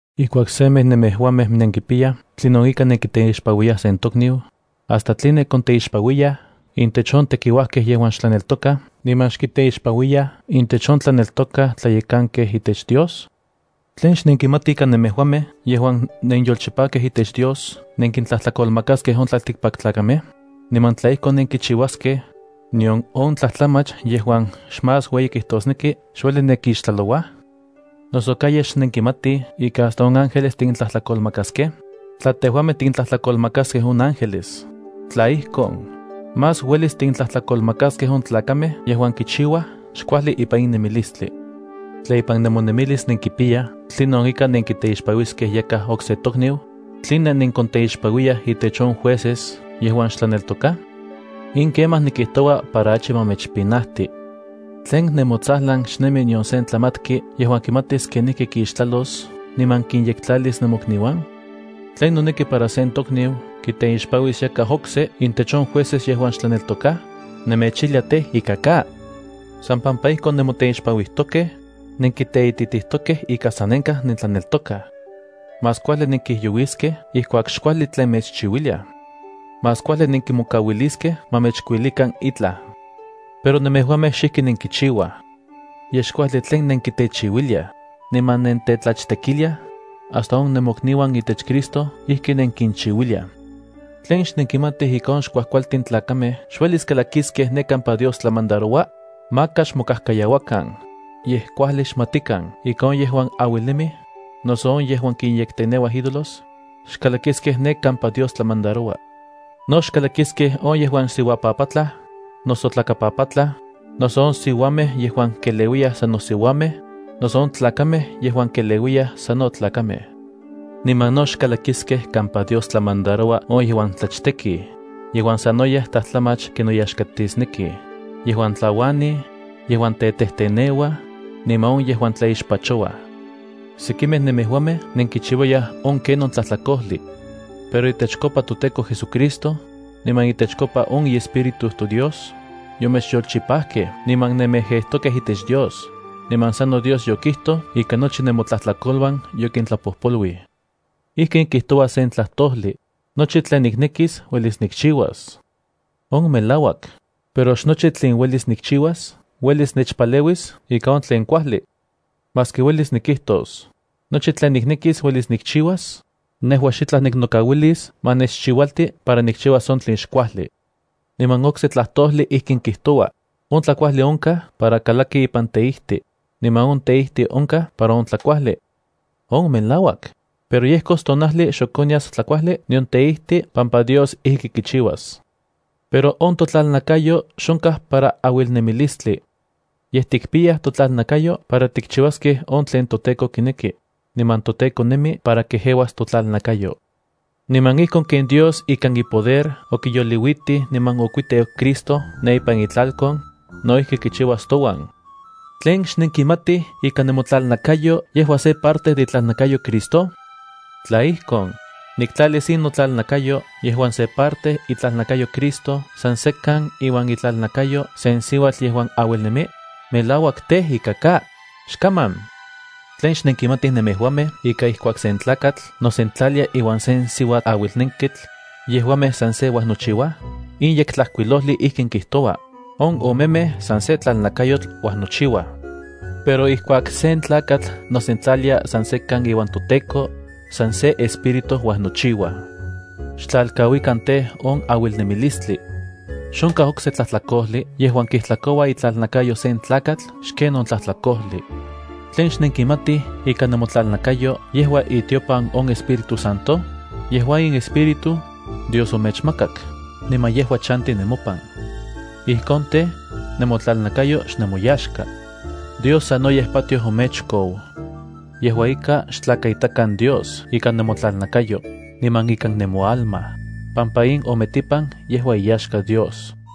Ijkuak semej nemejuamej nenkipiyaj tlinon ika nenkiteixpanuiyaj yakaj sen tokniu, ¿hasta tline konteixpanuiyaj intech on tekiuajkej yejuan xtlaneltokaj niman xintech on yolchipajkej itech Dios? ¿Tlen xnenkimatij ika nemejuamej yejuan nenyolchipajkej itech Dios nenkintlajtlakolmakaskej on tlaltikpaktlakamej? Niman tla ijkon nenkichiuaskej, ¿nion on tlajtlamach yejuan xmás ueyi kijtosneki xueli nekixtlalouaj? ¿Noso ka yej xnenkimatij ika hasta on ángeles tikintlajtlakolmakaskej? Tla tejuamej tikintlajtlakolmakaskej on ángeles, tla ijkon, más uelis tikintlajtlakolmakaskej on tlakamej yejuan kichiuaj xkuajli ipan in nemilistli. Tla ipan nemonemilis nenkipiyaj tlinon ika nenkiteixpanuiskej yakaj okse tokniu, ¿tline nenkonteixpanuiyaj intech on jueces yejuan xtlaneltokaj? In kemaj nikijtoua para achi ma mechpinajti. ¿Tlen nemotsajlan xnemi nion se tlamatki yejuan kimatis kenijki kixtlalos niman kinyektlalis nemokniuan? ¿Tlen noneki para sen tokniu kiteixpanuis yakaj okse intech on jueces yejuan xtlaneltokaj? ¡Nemechijlia tej, ika ka! San pampa ijkon nemoteixpanuijtokej, nenkiteititijtokej ika sanenkaj nentlaneltokaj. Más kuajli nenkijyouiskej ijkuak xkuajli tlen mechchiuiliaj. Más kuajli nenkimokauiliskej ma mechkuilikan itlaj. Pero nemejuamej xijki nenkichiuaj. Yej xkuajli tlen nenkitechiuiliaj niman nentetlachtekiliaj, hasta on nemokniuan itech Cristo ijki nenkinchiuiliaj. ¿Tlen xnenkimatij ika on xkuajkualtin tlakamej xuelis kalakiskej ne kampa Dios tlamandaroua? Maka xmokajkayauakan, yej kuajli xmatikan ika on yejuan auilnemij, noso on yejuan kinyekteneuaj ídolos, xkalakiskej ne kampa Dios tlamandaroua. No xkalakiskej on yejuan siuapapatlaj, noso tlakapapatlaj, noso on siuamej yejuan keleuiyaj sano siuamej, noso on tlakamej yejuan keleuiyaj sano tlakamej. Niman no xkalakiskej kampa Dios tlamandaroua on yejuan tlachtekij, yejuan sanoyej tlajtlamach kinoyaxkatisnekij, yejuan tlauanij, yejuan tetejteneuaj, niman on yejuan tlaixpachouaj. Sekimej nemejuamej nenkichiuayaj on ken on tlajtlakojli. Pero itechkopa toTEKO JesuCristo, niman itechkopa on iEspíritu toDios, yomechyolchipajkej niman nenmejejtokej itech Dios, niman sano Dios yokijtoj ika nochi nemotlajtlakoluan yokintlapojpoluij. Ijkin kijtoua sen tlajtojli: “Nochi tlen niknekis, uelis nikchiuas.” On melauak, pero xnochi tlen uelis nikchiuas uelis nechpaleuis ika on tlen kuajli. Maski uelis nikijtos: “Nochi tlen niknekis uelis nikchiuas”, pero nejua xitlaj niknokauilis ma nechchiualti para nikchiuas on tlen xkuajli. Niman okse tlajtojli ijkin kijtoua: “On tlakuajli onkaj para kalaki ipan teijti, niman on teijtl onkaj para on tlakuajli.” On melauak, pero yejkos sen tonajli ijkuak xok onyas tlakuajli nion teijti pampa Dios ijki kichiuas. Pero on totlalnakayo xonkaj para auilnemilistli. Yej tikpiyaj totlalnakayo para tikchiuaskej on tlen toTEKO kineki, niman toTEKO nemi para kejeuas totlalnakayo. Niman ijkon ken Dios ikan ipoder okiyoliuitij niman okuiteu Cristo ne ipan itlalkon, no ijki kichiuas touan. ¿Tlen xnenkimatij ika nemotlalnakayo yejua se parte de itlalnakayo Cristo? Tla ijkon, ¿niktlalis in notlalnakayo yejuan se parte itlalnakayo Cristo san sekan iuan itlalnakayo sen siuatl yejuan auilnemi? ¡Melauak tej ika ka, xkaman! ¿Tlen xnenkimatij nemejuamej ika ijkuak sen tlakatl nosentlalia iuan sen siuaauilnenketl, yejuamej san se uajnochiuaj? In Yektlajkuilojli ijkin kijtoua: “On omemej san se tlalnakayotl uajnochiua.” Pero ijkuak sen tlakatl nosentlalia san sekan iuan toTEKO, san se espíritu uajnochiuaj. Xtlalkauikan tej, on auilnemilistli. Xonkaj okse tlajtlakojli yejuan kijtlakoua itlalnakayo sen tlakatl xken on tlajtlakojli. ¿Tlen xnenkimatij ika nemotlalnakayo yejua itiopan on Espíritu Santo? Yejua in Espíritu, Dios omechmakak, niman yejua chanti nemopan. Ijkon tej, nemotlalnakayo xnemoyaxka. Dios sanoyej patioj omechkou. Yejua ika, xtlakaitakan Dios ikan nemotlalnakayo, niman ikan nemoalma, pampa in ometipan yejua iyaxka Dios.